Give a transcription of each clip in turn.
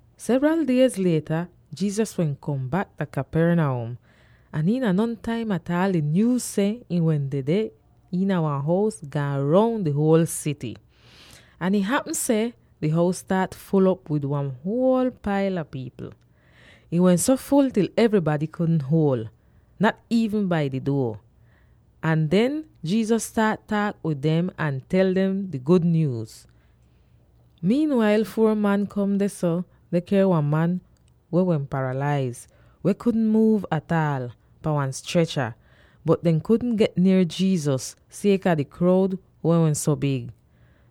Sevral diez lieta, Jesus wehn kom bak dah Capernaum, ahn iina nontaim ataal di nyuuz seh ihn wehn dedeh iina wan hous, gaan roun di huol sity. Ahn ih hapm seh di hous staat ful'op wid wan huol paila pipl. Ih wehn so ful til evrybady kudn huol, nat iivn bai di duo. Ahn den Jesus staat taak wid dem ahn tel dem di gud nyuuz. Wail dah taim kom, four man kom dehso, deh ker wan man weh wehn paralaiz —weh kudn muuv ataal— pahn wan strecha, bot dehn kudn get nier Jesus, sieka di kroud weh wehn so big.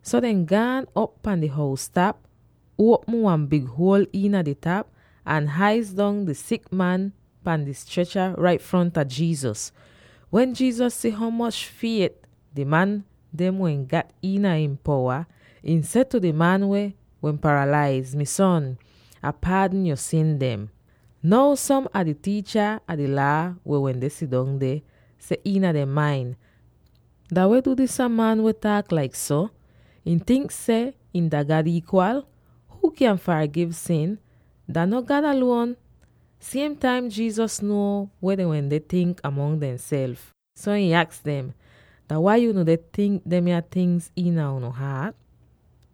So dehn gaan op pan di hous-tap, uopm wan big huol iina di tap, ahn hais dong di sik man pan di strecha rait fronta Jesus. Wen Jesus si ho moch fiet di man dem wehn gat iina ihn powa, ihn seh tu di man weh wehn paralaiz, “Mi son, Ah paadn yo sin dem.” Now, som a di tiicha a di Laa weh wende sidong, deh seh iina dehn main, “Dah weh du disa man weh taak laik so; ihn tink seh him dah God iikwal? Huu kyan fargiv sin; dah no God aluon?” Siem taim Jesus nuo weh dehn wende tink mongs demself, so ihn aks dem, “Dah wai unu deh tink demya tingz iina unu haat?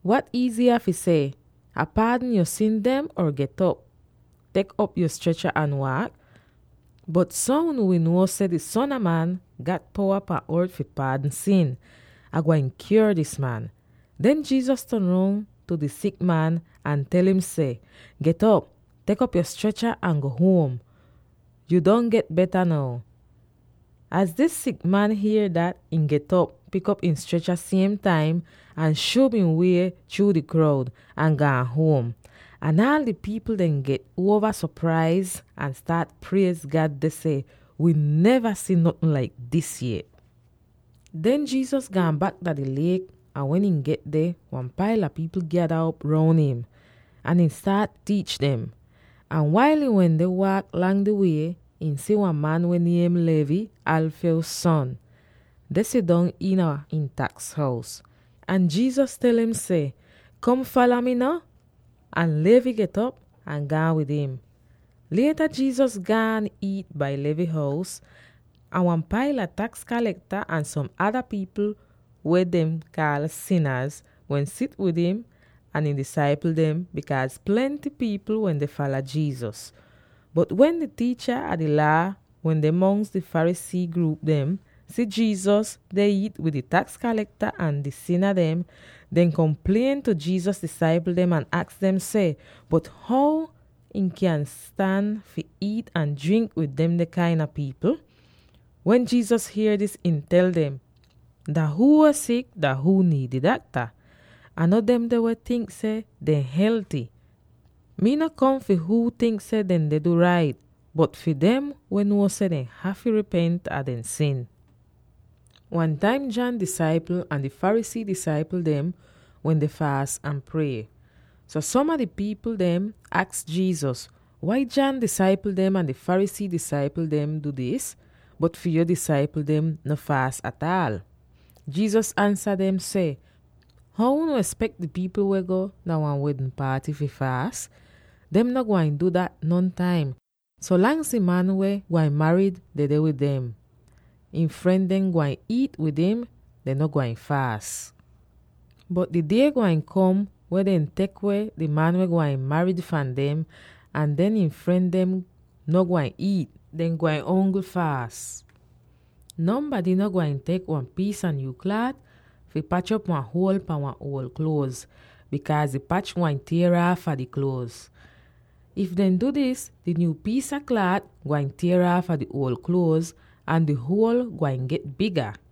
Wat iiziya fi seh, ‘Ah paadn yo sin dem,’ or ‘Get'op, tek op yo strecha ahn waak?’ Bot so unu wi nuo seh di Son a Man gat powa pan ort fi paadn sin, Ah gwain kyuor dis man.” Den Jesus ton roun tu di sik man, ahn tel im seh, “Get'op, tek op yo strecha ahn go huom; yu don get beta now.” Az di sik man hier dat, ihn get'op, pik op ihn strecha siem taim, ahn ihn shub ihn wie chruu di kroud, ahn gaan huom! Ahn aal di pipl dem get uova sopraiz ahn staat priez God deh seh, “Wi neva si notn laik dis yet!” Den Jesus gaan bak dah di liek ahn wen ihn get deh, wan paila pipl gyada op roun im, ahn ihn staat tiich dem. Ahn wail ihn wende waak lang di wie, ihn si wan man weh niem Levi, Alphaeus son, deh sidong iina ihn taks hous. Ahn Jesus tel im seh, “Kom! Fala mi no!” Ahn Levi get'op ahn gaan wid im. Lieta Jesus gaan iit dah Levi hous, ahn wan paila taks kalekta ahn som ada pipl weh dehn kaal “sinaz” wende sit dong wid him ahn ihn disaipl dem —bikaaz plenty pipl wende fala Jesus. Bot wen di tiicha a di Laa weh deh mongs di Pharisee gruup dem si Jesus deh iit wid di taks kalekta ahn di sina dem, dehn komplien tu Jesus disaipl dem ahn aks dem seh, “Bot how ihn kyan stan fi iit ahn drink wid demde kain a pipl?” Wen Jesus hier dis, ihn tel dem, “Dah huu weh sik, dah huu niid di dakta, ahn no demde weh tink seh dehn helty. Mii no kom fi huu tink seh dehn deh du rait, bot fi dem weh nuo seh dehn hafy ripent a dehn sin.” Wan taim John disaipl ahn di Pharisee disaipl dem wende faas ahn prie. So som a di pipl dehn aks Jesus, “Wai John disaipl dem ahn di Pharisee disaipl dem du dis, bot fi yo disaipl dehn no faas ataal?” Jesus ansa dem seh, “How unu espek di pipl weh go dah wan wedn paaty fi faas? Dehn no gwain du dat nontaim. So langs di man weh gwain marid dedeh wid dem, ihn fren dehn gwain iit wid im; dehn no gwain faas. Bot di die gwain kom wen dehn tek weh di man weh gwain marid fahn dem, ahn den ihn fren dem no gwain iit; dehn gwain ongl faas. “Nonbady no gwain tek wan piis a nyuu klaat fi pach op wan huol pahn wan uol kluoz, bikaaz di pach gwain tier aafa di kluoz. If dehn du dis, di nyuu piis a klaat gwain tier aafa di uol kluoz, ahn di huol gwain get biga.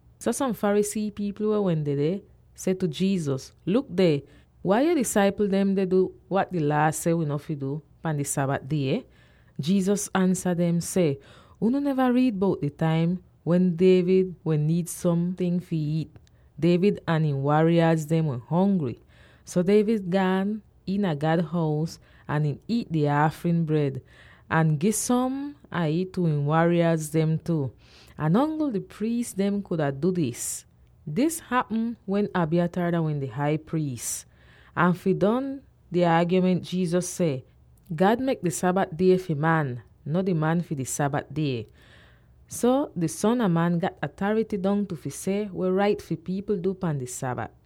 So som Pharisee pipl weh wehn dedeh seh tu Jesus, “Luk deh! Wai fi yo disaipl dem deh du wat di Laa seh wi no fi du pan di Sabat die?” Jesus ansa dem seh, “Unu neva riid bout di taim wen David wehn niid somting fi iit? David ahn ihn waria dem wehn hongry, so David gaan iina God hous ahn ihn iit di aafrin bred, ahn gi som a ih tu ihn waria dem tu. Ahn ongl di priis dem kuda du dis. Dis hapm wen Abiathar dah wehn di Hai Priis.” Ahn fi don di aagyoment Jesus seh, “God mek di Sabat die fi man, no di man fi di Sabat die. So di Son a Man gat atarity dongtu fi seh weh rait fi pipl du pan di Sabat.”